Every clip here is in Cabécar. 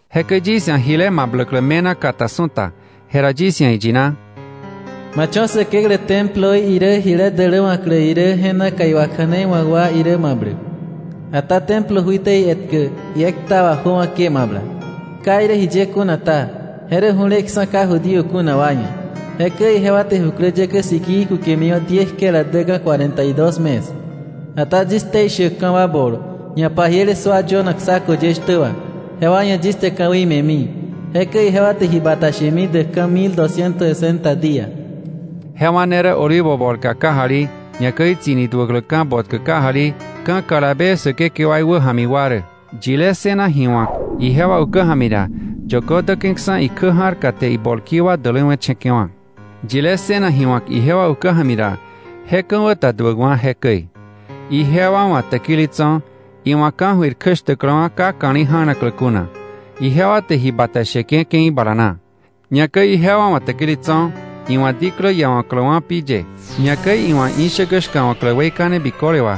Jekäi yis ia̱ jile mabläklä me̱na kata su̱ta, jera yis ia̱ iyina: “Ma cho̱ Säkeklä Temploí irä jile däläwa̱klä irä, je naka iwakja̱neiwa̱k wa irä mabläk. Ata Templo juiteí etkä iekta wà jöwa̱ ke mabla, ka irä jiye kuna ta, je rä ju̱leksa̱ ka Judío kuna wa ia̱; jekäi ijewa te jukläyäkä sikii kukemiwa̱ diekjela däka̱ cuarenta y dos mes. Ata yis ktei shäkka̱ wa bol, ñapajiele sua yönak saco ye shtä wà, jewa ia̱ yis te ka̱wei me̱mi, jekäi ijewa te ji bata shemi däkka̱ mil dosciento sesenta día.” Jewa ne rä olivo bolka kajali, ñakäi tsi̱ni duä tuläkläka̱ botkä kajali ka̱ kalabe Säkekewaí wäja̱mi wa rä. Yilé ssëna ji wa̱k ijewa ukä ja̱mi ra, yökö däke̱ksa̱ ikjä ja̱rka te ibolki wa däläwe̱che̱ke̱wa̱. Yilé ssëna ji wa̱k ijewa ukä ja̱mi ra, je ka̱wä ta duäkwa̱ jekäi. Ijewa wa̱ täkili tso̱, iwa̱ ka̱jöir kjäshtäkläwa̱ ka ka̱li̱ ja̱naklä kuna, ijewa te ji bata sheke̱ ke̱i bala na. Ñakäi ijewa wa̱ täkili tso̱, iwa̱ diklä iawa̱kläwa̱ pi ye, ñakäi iwa̱ ishäkä shka̱wa̱klä weikane biköle wà,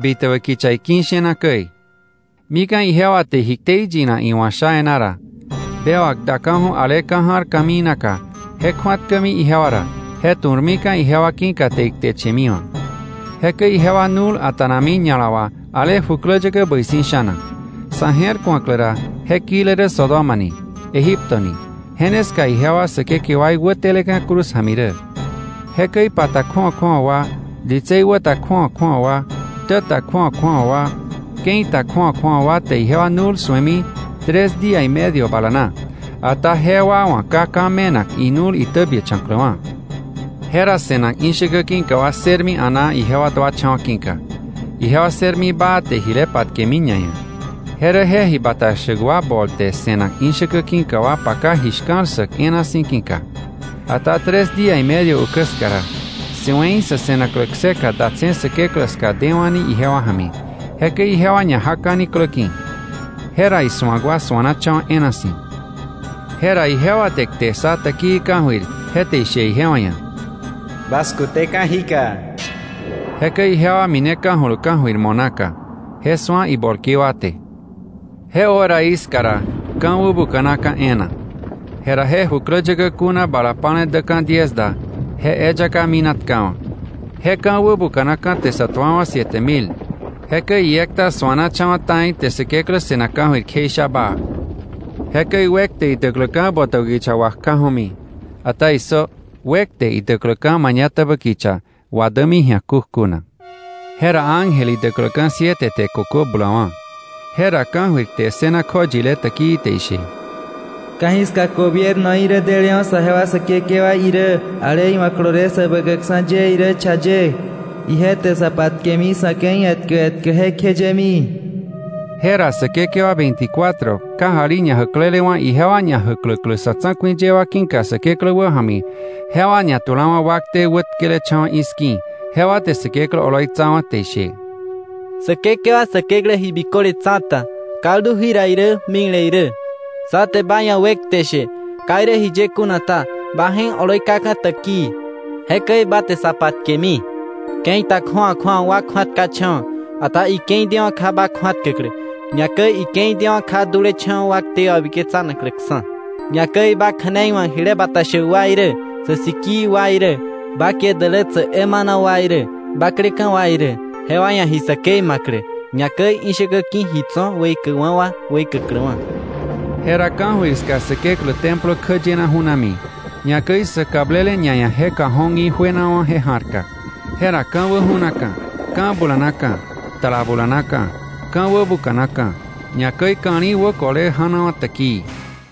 bitäbä kicha iki̱ ishena käi. Mika̱ ijewa te ji ktei yinak iwa̱ sha e̱ná ra, bewak daka̱ju̱ ale ka̱ ja̱r ka̱mii naka, je kju̱atkämi ijewa ra, je tu̱rmika̱ ijewa ki̱ka te ikteche̱miwa̱. Jekäi ijewa nu̱l a̱ta̱nami ña̱la wà ale jukläyäkä bäi si̱ sha̱na; sa̱ je̱r ku̱aklä ra je kile rä Sodoma ni, Egipto ni, je ne ska ijewa Säkekewaí wäteleka̱ cruz ja̱mi rä. Jekäi pa ta kju̱awa kju̱awa wa, ditsei wä ta kju̱awa kju̱awa wa, ktä ta kju̱awa kju̱awa wa, ke̱i ta kju̱awa kju̱awa wa te ijewa nu̱l su̱emi tres día y medio bala na, ata jewa wa̱ ka ka̱ me̱nak inu̱l itäbiächa̱kläwa̱. Jera se̱nak ishäkä ki̱ka wa ssërmi a̱naa ijewa duacha̱wa̱ ki̱ka, ijewa ssërmi baa te jile patkemi ñaia̱. Je rä je ji bata shäk wa bol te se̱nak ishäkä ki̱ka wa paka ji shka̱l ssäk e̱e̱na si̱ ki̱ka. Ata tres día y medio ukä ska ra, si̱we̱i sa̱ se̱naklä kseka datse̱ Säkeklä ska dewa̱ni ijewa ja̱mi. Jekäi ijewa ñajaka̱ni klä ki̱. Jera isu̱ak wa suanacha̱wa̱ e̱e̱na si̱. Jera ijewa te kte ssa täkii ka̱jöir, je te ishe ijewa ia̱: “¡Bas kuteka̱ jíka!” Jekäi ijewa mineka̱julu ka̱jöir mo̱ naka, je su̱a ibolki wa te. Je horaí ska ra ka̱ wäbuka̱naka̱ e̱e̱na, jera je jukläyäkä kuna bala pa̱le däka̱ diez da, je eyaka minatkawa̱. Je ka̱ wäbuka̱naka̱ te sa tuawa̱ siete mil. Jekäi iekta suanacha̱wa̱ ta̱i, te Säkeklä se̱nak ka̱jöir kjeisha baa. Jekäi “wekte” idäkläka̱ botäbä kicha wa kjaju̱mi. Ata ¡issö! “Wekte” idäkläka̱ mañatäbä kicha wadämi ji̱a kukjuna. Jera ángel idäkläka̱ siete te kökö bulawa̱. Jera ka̱jöir kte ssëna kjoyile täkii te ishe: “Ka̱jiska gobiernoí rä delewa̱ saje wa Säkekewaí irä ale iwa̱ kolole Säbäkäkksa̱ ye irä cha ye, ije te sa patkemi sa̱ ke̱i etkä etkä jekjeyemi.” Jera säkekewa veinticuatro kajali ñajäklelewa̱ ijewa ñajäkläklä sa̱ tsa̱ku̱i ye wa ki̱ka Säkeklä wäja̱mi, jewa ñatulawa̱ wakte wätkelecha̱wa̱ i̱ski̱, jewa te Säkeklä oloitsawa̱, te ishe: “Säkekewa Säkeklä Ji Biköle Tsa̱ta, kaldu jira irä, mikle irä, sá te ba ia̱ wekte she, Ka irä jiye kuna ta Ba je̱k oloi kaka̱ täkii, jekäi ba te sa patkemi. Ke̱i ta kju̱awa kju̱awa wa kju̱atkacha̱wa̱, ata ike̱i dewa̱ kja ba kju̱atkäklä, ñakäi ike̱i dewa̱ kja dulecha̱wa̱ wa ktei wabiketsanakläksa̱, ñakäi ba kja̱nei wa̱k ji bata shäk wa irä, sä sikii wa irä, ba kie dälätsäk emana wa irä, bakleka̱ wa irä, jewa ia̱ ji säkei ma̱klä, ñakäi ishäkä ki̱ ji tso̱ weikäkwa̱ wa weikäkläwa̱.” Jera ka̱jöir ska Säkeklä templo kjäyena ju̱nami; ñakäi sä kablele ñaia̱ je cajón í juenawa̱ je ja̱rka. Jera ka̱wä ju̱naka̱, ka̱ bulanaka̱, tala bulanaka̱, ka̱ wäbuka̱naka̱, ñakäi ka̱li̱ wäkole ja̱nawa̱ täkii.